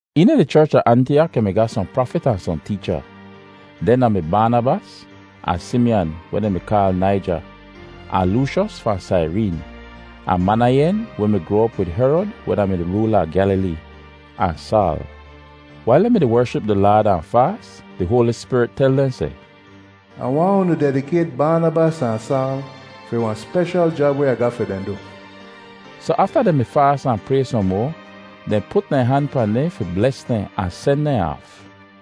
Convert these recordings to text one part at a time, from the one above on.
Eena di cherch da Antiyak yu mi ga sohn prafit ahn sohn teecha. Dehn da-mi Baanabas, ahn Simiyan weh dehn kaal Naijer, ahn Looshos fahn Saireen, ahn Manayen weh mi groa op wid Herod weh da-mi di roola a Gyalilee, ahn Saal. Wail dehn mi-di wership di Laad ahn di faas, di Hoali Spirit tel dehn seh, “Ah waahn unu dedikayt Baanabas ahn Saal fi wahn speshal jab weh Ah ga fi dehn du.” Soh afta dehn mi faas ahn pray sohn moa, dehn put dehn han pahn dehn fi bles dehn ahn sen dehn aaf.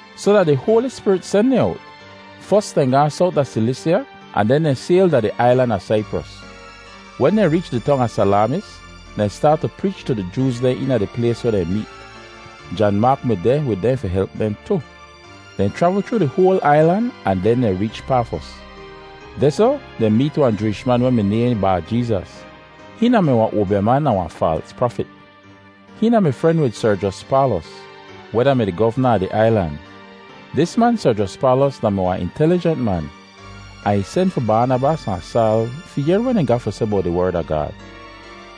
Soh da di Hoali Spirit sen dehn owt. Fos, dehn gaahn sowt da Silisya ahn den dehn sayl da di ailan a Saipros. Wen dehn reech di tong a Salaamis, dehn staat tu preech tu di Jooz dehn eena di plays weh dehn meet. Jan Maak mi deh wid dehn di help dehn tu. Dehn chravl chroo di hoal ailan ahn den dehn reech Pafos. Dehsoh dehn meet wahn Jooish man weh mi nayhn Baa-Jeezas. Hihn da-mi wahn oabyaman ahn wahn faals prafit. Hihn mi fren op wid Serjyos Paalos, weh da-mi di govna a di ailan. Dis man Serjyos Paalos da-mi wahn intelijent man, ahn ih sen fi Baanabas ahn Saal fi yehr weh dehn ga fi seh bowt di Werd a Gaad.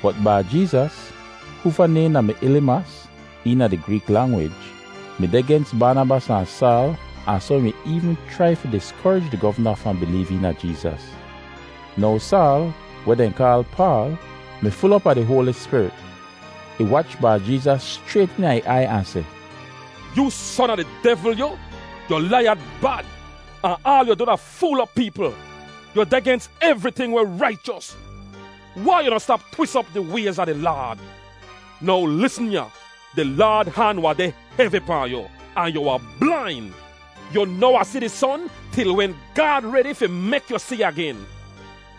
Bot Baa-Jeezas, hoofa naym da-mi Elimas eena di Greek langwij, mi deh gens Baanabas ahn Saal ahn soh ih mi eevn chrai fi diskorij di govna fahn bileev eena Jeezas. Now Saal, weh dehn kaal Paal, mi ful op a di Hoali Spirit. Ih wach Baa-Jeezas schrayt eena ih aiy ahn seh, “Yoo son a di devl, yu! Yu laiyad bad, ahn aal yu du da fool op peepl. Yu deh gens evriting weh raichos. Wai yu noh stap twis op di wayz a di Laad? Now lisn ya. Di Laad han wahn deh hevi pahn yu, ahn yu wahn blain. Yu noh wahn si di son til wen Gaad redi fi mek yu si agen.”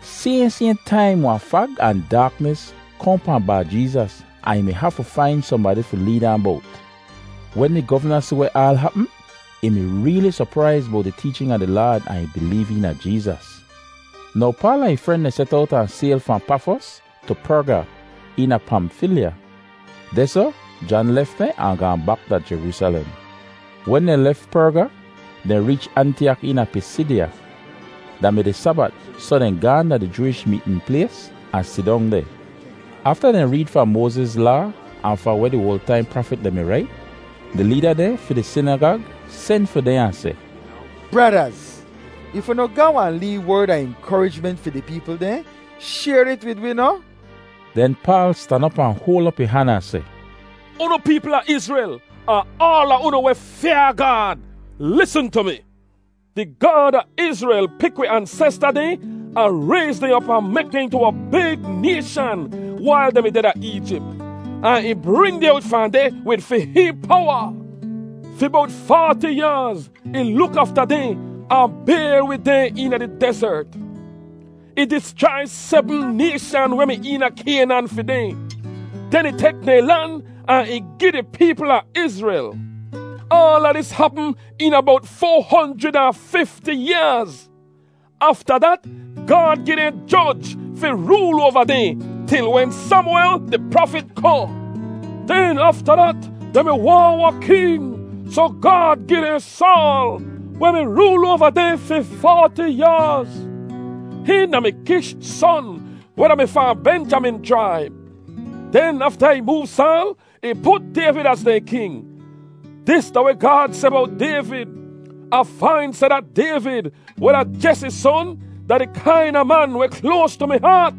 Sayhn, sayhn taim wahn fag ahn daaknis kohn pahn Baa-Jeezas ahn ih mi hafu fain sohnbadi fi leed ahn bowt. Wen di govna si weh aal hapm, ih mi reeli sopraiz bowt di teechin a di Laad ahn ih bileev eena Jeezas. Now Paal ahn ih fren dehn set owt ahn sayl fahn Pafos tu Perga eena Pamfilya. Dehsoh Jan lef dehn ahn gaahn bak da Jeroosalem. Wen dehn lef Perga, dehn reech Antiyak eena Pisidya. Da mi di Sabat soh dehn gaahn da di Jooish meetn plays ahn sidong deh. Afta dehn reed fahn Moaziz Laa ahn fahn weh di oal taim prafit dehn mi rait, di leeda dehn fi di sinagag sen fi dehn ahn seh, “Bradaz, if unu ga wahn lee werd a inkorijment fi di peepl dehn, shayr it wid wi noh.” Den Paal stan op ahn hoal op ih han ahn seh, “Unu peepl a Izrel, ahn aala unu weh fyaa Gaad, lisn tu mi! Di Gaad a Izrel pik wi ansesta dehn ahn rayz dehn op ahn mek dehn intu wahn big nayshan wail dehn mi deh da Eejip. Ahn ih bring dehn owt fahn deh wid fi hihn powa. Fi bowt faati yaaz ih luk afta dehn ahn bayr wid dehn eena di dezert. Ih dischrai sebm nayshan weh mi eena Kaynan fi dehn. Den ih tek dehn lan ahn ih gi di peepl a Izrel. Aala dis hapm eena bowt foa honjrid ahn fifti yaaz. “Afta dat Gaad gi dehn joj fi rool oava dehn til wen Samwel, di prafit, kohn. Den afta dat dehn mi waahn wahn king, soh Gaad gi dehn Saal, weh mi rool oava dehn fi faati yaaz. Hihn da-mi Kish son weh da-mi fahn Benjamin chraib. Den afta ih moov Saal, ih put Dayvid az dehn king. Dis da weh Gaad seh bowt Dayvid: ‘Ah fain seh dat Dayvid, weh da Jesi son, da di kaina man weh kloas tu mi haat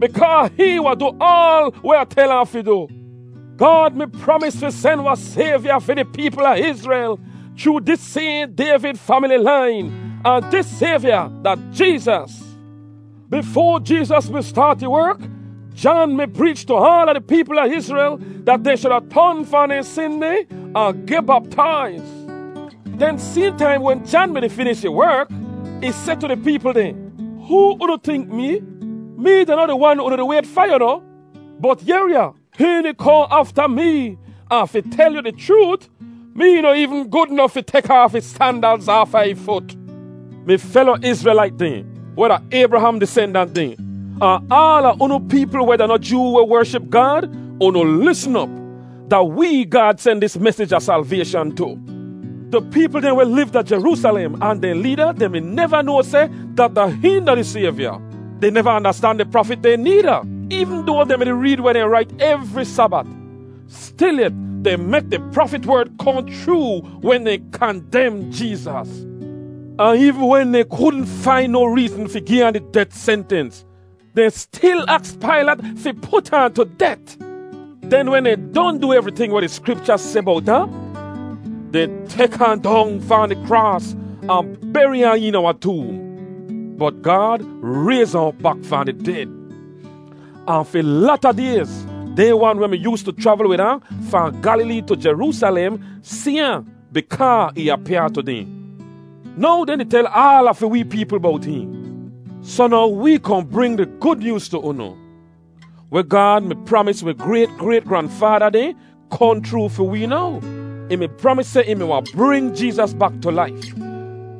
bikaa hihn wahn du aal weh Ah tel ahn fi du.’ “Gaad mi pramis fi sen wahn Sayvya fi di peepl a Izrel chroo dis sayhn Dayvid famili lain, ahn dis Sayvya da Jeezas. Bifoa Jeezas mi staat ih werk, Jan mi preech tu aala di peepl a Izrel dat dehn shuda ton fahn dehn sin dehn ahn geh baptaiz. Den sayhn taim wen Jan mi-di finish ih werk, ih seh tu di peepl dehn, ‘Hoo unu tink mee? Mee da noh di wan weh unu di wayt fa, yu noh! Bot yehr ya! Hihn di kohn afta mee ahn fi tel yu di chroot, mee noh eevn gud nof fi tek aaf ih sandalz aafa ih fut!’ “Mi felo Izrelait dehn, weh da Aybraham disendant dehn, ahn aala unu peepl weh da noh Joo weh wership Gaad, unu lisn op! Da wee Gaad sen dis mesij a salvayshan tu! Di peepl dehn weh liv da Jeroosalem ahn dehn leeda dehn mi neva noa seh dat da hihn da di Sayvya. Dehn neva andastan di prafit dehn needa, eevn doa dehn mi-di reed weh dehn rait evri Sabat. Stilyet dehn mek di prafit werd kohn chroo wen dehn kandem Jeezas. Ahn eevn wen dehn kudn fain no reezn fi gi ahn di det sentens, dehn stil aks Pailat fi put ahn tu det. Den wen dehn don du evriting weh di Skripcha seh bowt ahn, dehn tek ahn dong fahn di kraas ahn beri ahn eena wahn toom. Bot Gaad rayz ahn op bak fahn di ded. Ahn fi lata dayz dehn wan weh mi yoostu chravl wid ahn fahn Gyalilee tu Jeroosalem si ahn bikaa ih apyaa tu dehn. Now dehn di tel aala fi wee peepl bowt hihn. “Soh now wee kohn bring di Gud Nyooz tu unu. Weh Gaad mi pramis wi grayt, grayt, granfaada dehn kohn chroo fi wee now. Ih mi pramis seh ih mi wahn bring Jeezas bak tu laif.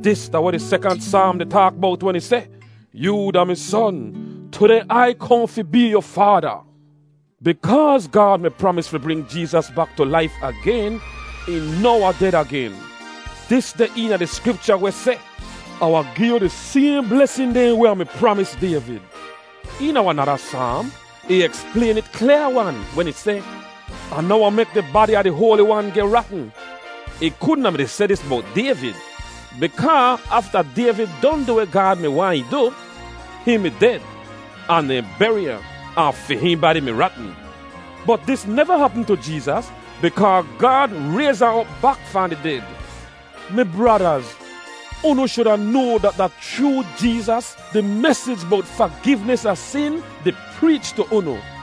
Dis da weh di sekant Saam di taak bowt wen ih seh, ‘Yoo da mi Son; tudeh Ai kohn fi bee yu Faada.’ Bikaaz Gaad mi pramis fi bring Jeezas bak tu laif agen, ih noh wahn ded agen. Dis deh eena di Skripcha weh seh, ‘Ah wahn gi yu di sayhn blesin dehn weh Ah mi pramis Dayvid.’ Eena wahn nada Saam, ih eksplayn it klyaa-wan wen ih seh, ‘Ah noh wahn mek di badi a di Hoali Wan geh ratn.’ Ih kudn a mi-di seh dis bowt Dayvid bikaa afta Dayvid don du weh Gaad mi waahn ih du, hihn mi ded, ahn dehn beri ahn, ahn fi hihn badi mi ratn. Bot dis neva hapm tu Jeezas bikaa Gaad rayz ahn op bak fahn di ded. “Mi bradaz, unu shuda noa dat da chroo Jeezas di mesij bowt fagivnis a sin di preech tu unu.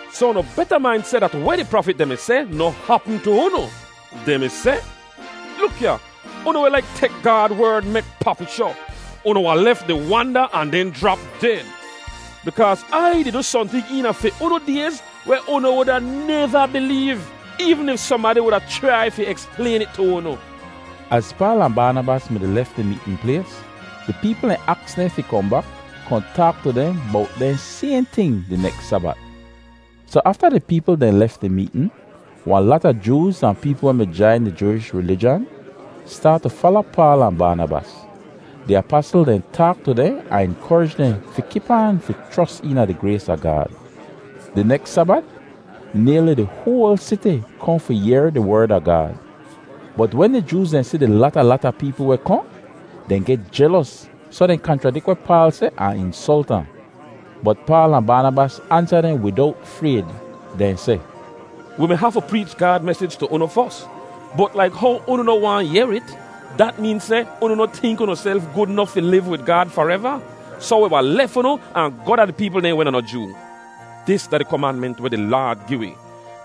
Soh unu beta main seh dat weh di prafit dehn mi seh noh hapm tu unu. Dehn mi seh, ‘Luk ya, unu weh laik tek Gaad Werd mek papishoh, unu wahn lef di wanda ahn den jrap ded. Bikaaz Ai di du sohnting eena fi unu dayz weh unu wuda neva bileev eevn if sohnbadi wuda chrai fi eksplayn it tu unu.’” Az Paal ahn Baanabas dehn mi-di lef di meetn plays, di peepl dehn aks dehn fi kohn bak kohn taak tu dehn bowt dehn sayhn ting di neks Sabat. Soh afta di peepl dehn lef di meetn, wahn lata Jooz ahn peepl weh mi jain di Jooish rilijan, staat tu fala Paal ahn Baanabas. Di apasl dehn taak tu dehn ahn inkorij dehn fi kip aan fi chros eena di grays a Gaad. Di neks Sabat nayli di hoal siti kohn fi yehr di Werd a Gaad. Bot wen di Jooz dehn si di lata, lata peepl weh kohn, dehn geh jelos soh dehn kanchradik weh Paal seh ahn insolt ahn. Bot Paal ahn Baanabas ansa dehn widowt frayd. Dehn seh, “Wi mi hafu preech Gaad mesij tu unu fos, bot laik how unu noh waahn yehr it, dat meen seh unu noh tink unuself gud nof fi liv wid Gaad fareva. Soh wi wahn lef unu ahn goh da di peepl dehn weh da noh Joo. Dis da di komanment weh di Laad gi wi: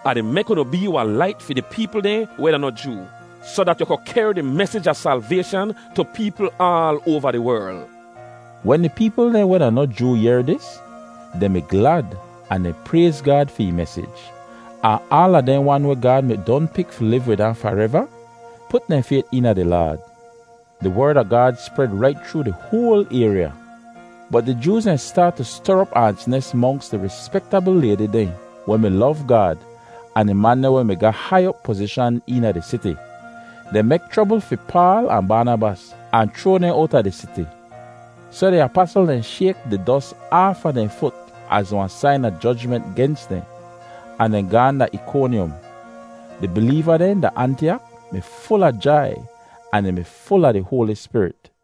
‘Ah di mek unu bee wahn lait fi di peepl dehn weh da noh Joo, soh dat yu ku kehr di mesij a salvayshan tu peepl aal oava di werl.’” Wen di peepl dehn weh da noh Joo yehr dis, dehn mi glad ahn dehn prayz Gaad fi ih mesij. Ahn aala dehn wan weh Gaad mi don pik fi liv wid hihn fareva, put dehn fayt eena di Laad. Di Werd a Gaad spred rait chroo di hoal ayrya. Bot di Jooz dehn staat tu ster op aans nes monks di rispektabl laydi dehn weh mi lov Gaad ahn di man dehn weh mi ga hai op pozishan eena di siti. Dehn mek chrobl fi Paal ahn Baanabas ahn chroa dehn owta di siti. Soh di apasl dehn shayk di dos aafa dehn fut az wahn sain a jojment gens dehn, ahn dehn gaahn da Ikonyom. Di bileeva dehn da Antiyak mi ful a jai ahn dehn mi ful a di Hoali Spirit.